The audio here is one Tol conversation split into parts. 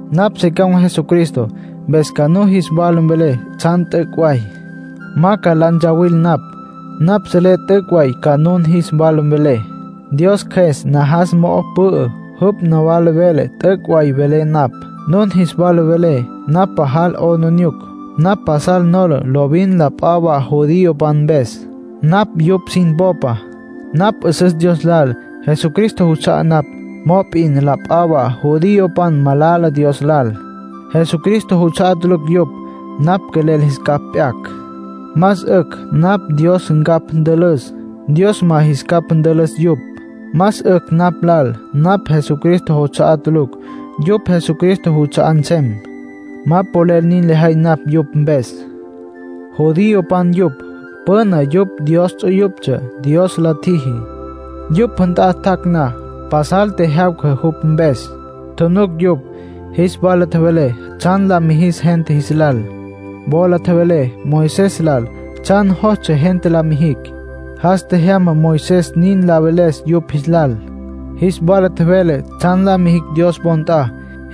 Napj se con̈ Jesucristo, mpes ca nun jis wala mvelé tsjan t'üc' way. Ma ca la ntsawil napj. Napj selé t'üc' way ca nun jis wala mvelé. Dios Cjües najas mo'o pü'ü, jupj nawala vele t'üc' way velé napj. Nun jis wala velé napj pajal 'aplijila. Napj pasal nola lovin la p'a wa judiopan mpes. Napj yupj sin popa. Napj 'üsüs Dios lal; Jesucristo juts'a'á napj. Mop'in la p'a wa judiopan malala Dios lal; Jesucristo juts'a'á tulucj yupj. Napj quelel jis capj p'yacj. Más 'ücj napj lal Dios ncapj ntülüs, Dios ma jis capj ntülüs yupj. Más 'ücj napj lal napj Jesucristo juts'a'á tulucj, yupj Jesucristo juts'a'á nsem. Ma polel nin lejay napj yupj mpes. Judiopan yupj. Püna yupj Dios ts'uyuptsja, Dios lis tjiji. Yupj nt'a tjac' na, pasal tjejyawca jupj mpes, tjunuc yupj. Jis wala tjevele tsjan la mijis gente jis lal. Wola tjevele Moisés lal tsjan jostsja gente la mijicj. Jas tjejyama Moisés nin la veles yupj jis lal. Jis wala tjevele tsjan la mijicj Dios wo nt'a.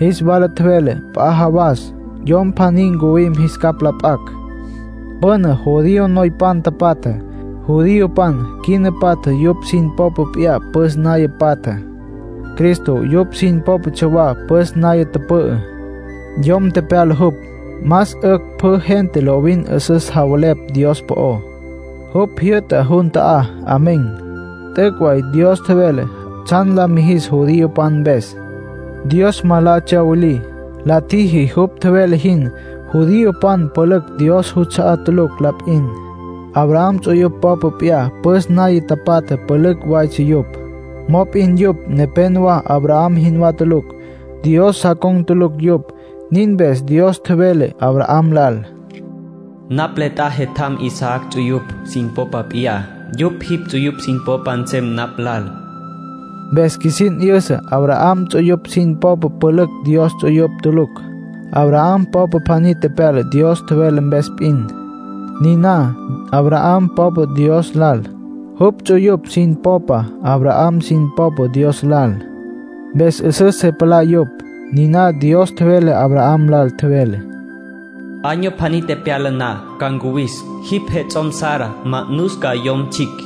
Jis wala tjevele p'a jawas Yom pjaní ncuwim jis capj la p'acj. Püna judío noypan tapatja. Judiopan quina patja yupj sin popa p'iyá püs naya patja. Cristo yupj sin pópatsja wa püs naya tüpü'ü. Yom tepyala jupj. Más 'ücj pjü gente lovin 'üsüs javelepj Dios po'ó. Jupj jyü'ta jun ta'á. Amén. T'üc' way Dios tjevele tsjan la mijis judiopan mpes. Dios ma la tsyawilí. La tjiji jupj tjevele jin. Judiopan pülücj Dios juts'a'á tulucj la p'in. Abraham ts'uyupj popa p'iyá püs naya tapatja pülücj waytsja yupj. Mop'in yupj nepenowá Abraham jinwá tulucj. Dios sa con̈ tulucj yupj. Nin mpes Dios tjevele Abraham lal: “Napj le t'a jetjam Isaac ts'uyupj sin popa p'in; yupj jipj ts'uyupj sin popa nsem napj lal”. Mpes qjuisin 'yüsa Abraham ts'uyupj sin popa pülücj Dios ts'uyupj tulucj. Abraham popa pjaní tepyala Dios tjevele mpes p'in. Niná Abraham popa Dios lal. Jupj ts'uyupj sin popa Abraham sin popa Dios lal, mpes 'üsüs se palá yupj. Niná Dios tjevele Abraham lal. Tjevele: “Año pjaní tepyala na, ca ncuwis. Jipj jets'om, Sara, ma'nus ca yom tsjicj”,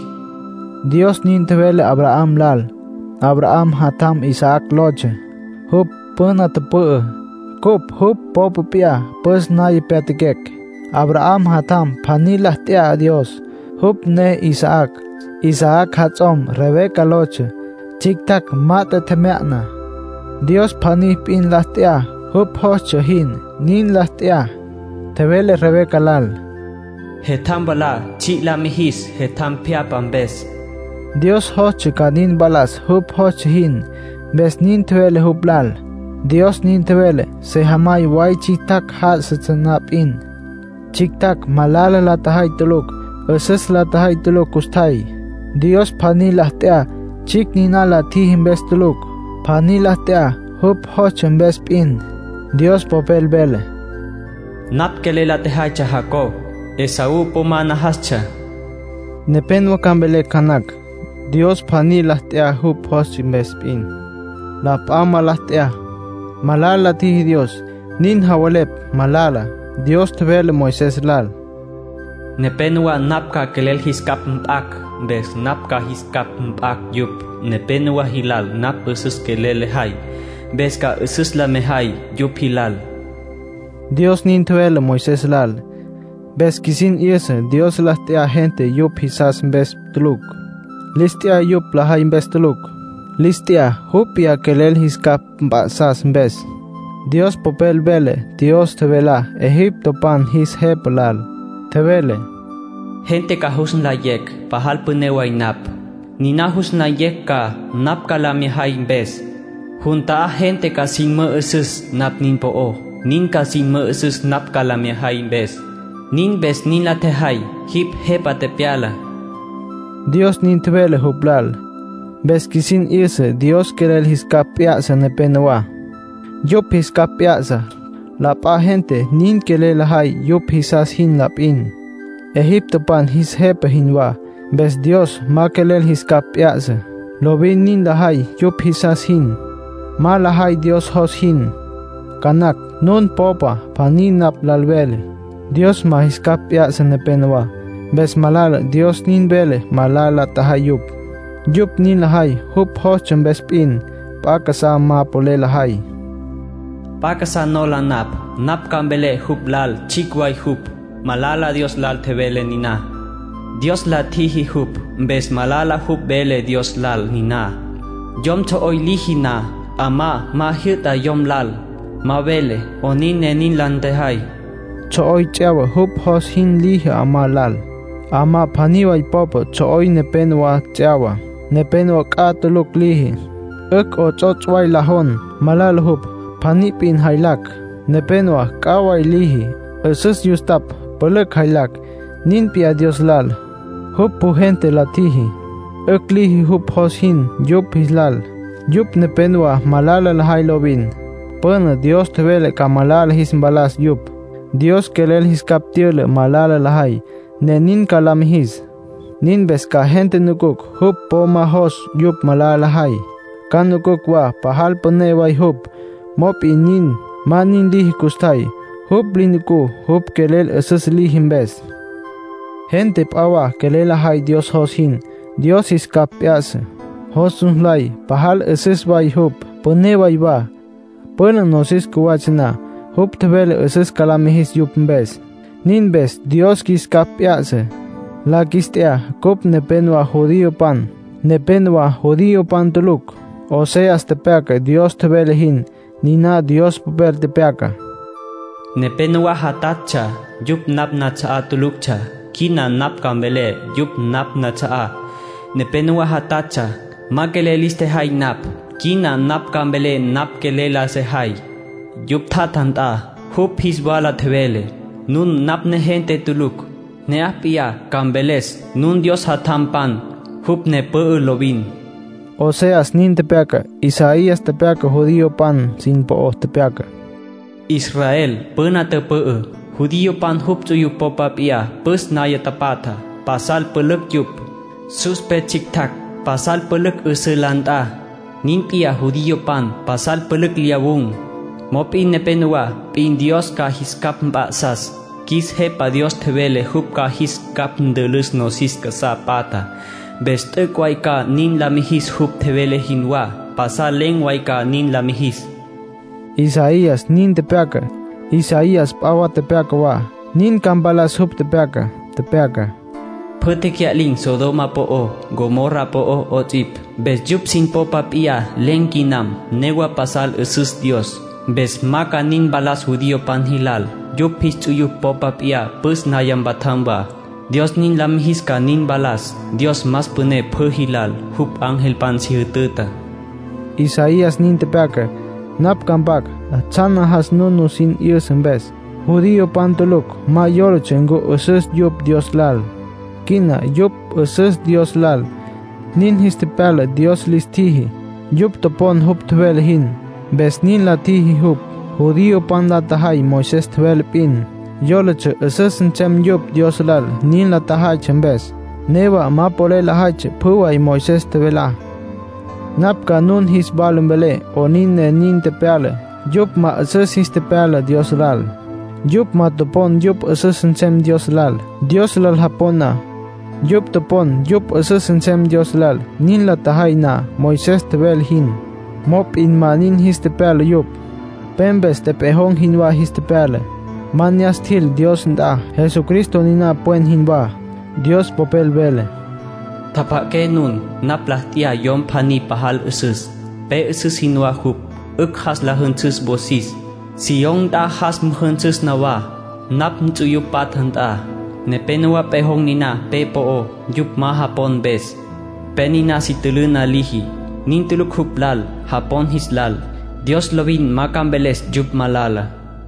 Dios nin tjevele Abraham lal. Abraham jatjam Isaac lotsja. Jupj püna tüpü'ü, cupj jupj popa p'iyá püs naya pyatjaquecj. Abraham jatjam pjaní la t'ya Dios. Jupj ne Isaac. Isaac jats'om Rebeca lotsja. Tsjictjacj mat'e tjemya'na. Dios pjaní p'in la t'ya. Jupj jostsja jin, nin la t'ya. Tjevele Rebeca lal: “Jetjam mwalá tsji' la mijis jetjam pjyapja mpes”. Dios jostsja ca nin mpalas jupj jostsja jin, mpes nin tjevele jupj lal. Dios nin tjevele sejamay way tsjictjacj já'asatsja na p'in. Tsjictjacj malala la tjajay tulucj, 'üsüs la tjajay tulucj custjay. Dios pjaní la t'ya, tsjicj niná la tjiji mpes tulucj. Pjaní la t'ya jupj jostsja mpes p'in. Dios Popel vele: “Napj quelel la tjajay Jacob. Esaú po ma najastsja.” Nepénowa ca mvelecj ca nacj: “Dios pjaní la t'ya jupj jostsja mpes p'in; la p'a ma la t'ya. Malala la tjiji Dios.” Nin javelepj malala. Dios tjevele Moisés lal: “Nepénowa napj ca quelel jis capj mp'acj. Mpes napj ca jis capj mp'acj yupj. Nepénowa jilal napj 'üsüs quelel lejay. Mpes ca 'üsüs la mejay yupj jilal”, Dios nin tjevele Moisés lal. Mpes qjuisin 'yüsa Dios lis t'ya gente yupj jisas mpes tulucj. Lis t'ya yupj lajay mpes tulucj. Lis t'ya jupj p'iyá quelel jis capj mp'a'sas mpes. Dios Popel vele Dios tjevelá egiptopan jis jepa lal. Tjevele: “Gente ca jus nlayecj pajal püné way napj. Niná jus nlayecj ca, napj ca la mya jay mpes. Jun ta'á gente ca sin mü'üsüs napj nin po'ó. Nin ca sin mü'üsüs napj ca la mya jay mpes. Nin mpes nin la tjejay jipj jepa tepyala”, Dios nin tjevele jupj lal. Mpes qjuisin 'yüsa Dios quelel jis capj p'ya'sa nepenowá. Yupj jis capj p'ya'sa. La p'a gente nin quelel lajay yupj jisas jin la p'in, egiptopan jis jepa jinwá. Mpes Dios ma quelel jis capj p'ya'sa. Lovin nin lajay yupj jisas jin. Ma lajay Dios jos jin. Ca nacj nun popa pjaní napj lal mveles: “Dios ma jis capj p'ya'sa nepenowá. Mpes malala Dios nin vele malala la tjajay yupj. Yupj nin lajay jupj jostsja mpes p'in. P'a casá ma polel lajay.” P'a casá nola napj. Napj ca mvelé jupj lal tsjicj way jupj, malala Dios lal tjevele niná. Dios la tjiji jupj, mpes malala jupj vele Dios lal niná. Yom tsjo'oy liji na, 'amá ma jyü'ta yom lal. Ma vele 'onin ne nin la ntjejay. Tsjo'oy ts'yawa jupj jos jin liji 'amá lal. 'Amá pjaní way popa tsjo'oy nepénowa ts'yawa. Nepénowa c'a tulucj liji. 'Ücj 'ots'ots' way la jon. Malala jupj, pjaní p'in jaylacj. Nepénowa c'a way liji, 'üsüs yustapj, pülücj jaylacj. Nin p'iyá Dios lal. Jupj pjü gente la tjiji. 'Ücj liji jupj jos jin yupj jis lal. Yupj nepenowá malala lajay lovin. Püna Dios tjevele ca pjü malala jis mpalas yupj. Dios quelel jis capj tyüla malala lajay, ne nin ca la mijis. Nin mpes ca gente nucucj jupj po ma jos yupj malala lajay, ca nucucj wa pajal püné way jupj. Mop'in nin, ma nin liji custjay. Jupj li nucú, jupj quelel 'üsüs liji mpes. Gente p'a wa quelel lajay Dios jos jin. Dios jis capj p'ya'sa. Jos jus nlay pajal 'üsüs way jupj, püné way wa. Püna nosis cjuwatsja na, jupj tjevele 'üsüs ca la mijis yupj mpes. Nin mpes Dios qjuis capj p'ya'sa. La qjuis t'ya. Cupj nepénowa judiopan. Nepénowa judiopan tulucj. Oseas tepyaca Dios tjevele jin. Niná Dios Popel. Tepyaca: “ ‘Nepénowa játjatsja, yupj napj nats'a'á tuluctsja. Quina napj ca mvelé yupj napj nats'a'á. Nepénowa játjatsja, ma quelel lis tjejay napj. Quina napj ca mvelé napj quelel la sejay.’ Yupj tjatja nt'a, jupj jis wala tjevele: ‘Nun napj negente tulucj’. Ne'aj p'iyá, ca mveles nun Dios jatjampan. Jupj ne pü'ü lovin.” Oseas nin tepyaca. Isaías tepyaca judiopan sin po'ó. Tepyaca: “Israel püna tüpü'ü. Judiopan jupj ts'uyupj popa p'iyá püs naya tapatja. Pasal pülücj yupj. Sus pe tsjictjacj pasal pülücj 'üsǘ la nt'a. Nin p'iyá judiopan pasal pülücj lyawun̈. Mop'in nepénowa p'in Dios ca jis capj mp'a'sas. Qjuis Jepa Dios tjevele jupj ca jis capj ntülüs nosis casá patjá. Mpes t'üc' way ca nin la mijis jupj tjevele jinwá. Pasal len̈ way ca nin la mijis.” Isaías nin tepyaca. Isaías p'a wa tepyaca wa. Nin ca mpalas jupj tepyacá. Tepyaca: “Pjü tecya'lin̈ Sodoma po'ó, Gomorra po'ó 'ots'ipj. Mpes yupj sin popa p'iyá len̈ quinam. Newa pasal 'üsüs Dios. Mpes ma ca nin mpalas judiopan jilal. Yupj jis ts'uyupj popa p'iyá püs naya mpatjam wa, Dios nin la mijis ca nin mpalas. Dios más püné pjü jilal. Jupj angelpan si jütüta.” Isaías nin tepyaca. Napj ca mpac tsjan najas nun nusin 'yüsa mpes. Judiopan tulucj ma yólatsja ncu 'üsüstsja yupj Dios lal. Quina yupj 'üsüs Dios lal, nin jis tepyala Dios lis tjiji. Yupj topon jupj tjevele jin, mpes nin la tjiji jupj. Judiopan la tjajay Moisés tjevele p'in. Yólatsja 'üsüs nsem yupj Dios lal nin la tjajaytsja mpes. Newa ma polel lajaytsja pjü way Moisés tjevelá. Napj ca nun jis wala mvelé 'onin ne nin tepyala, yupj ma 'üsüs jis tepyala Dios lal. Yupj ma topon yupj 'üsüs nsem Dios lal, Dios lal japon na. Yupj topon yupj 'üsüs nsem Dios lal nin la tjajay na Moisés tjevele jin. Mop'in ma nin jis tepyala yupj. Pe mpes tepejon̈ jinwá jis tepyala. Ma ne'as tjil Dios nt'a. Jesucristo niná pwen jinwá. Dios Popel vele: “Tjapja'aqué nun. Napj la t'ya yom pjaní pajal 'üsüs. Pe 'üsüs jinwá jupj, 'ücj jas la jünsüs wosis. Sión nt'a jas müjünsüs nawá, napj nts'uyupj patja nt'a. Nepénowa pejon̈ niná pe po'ó, yupj ma japon mpes. Pe niná si tülüna liji. Nin tulucj jupj lal japon jis lal. Dios lovin ma ca mveles yupj malala.”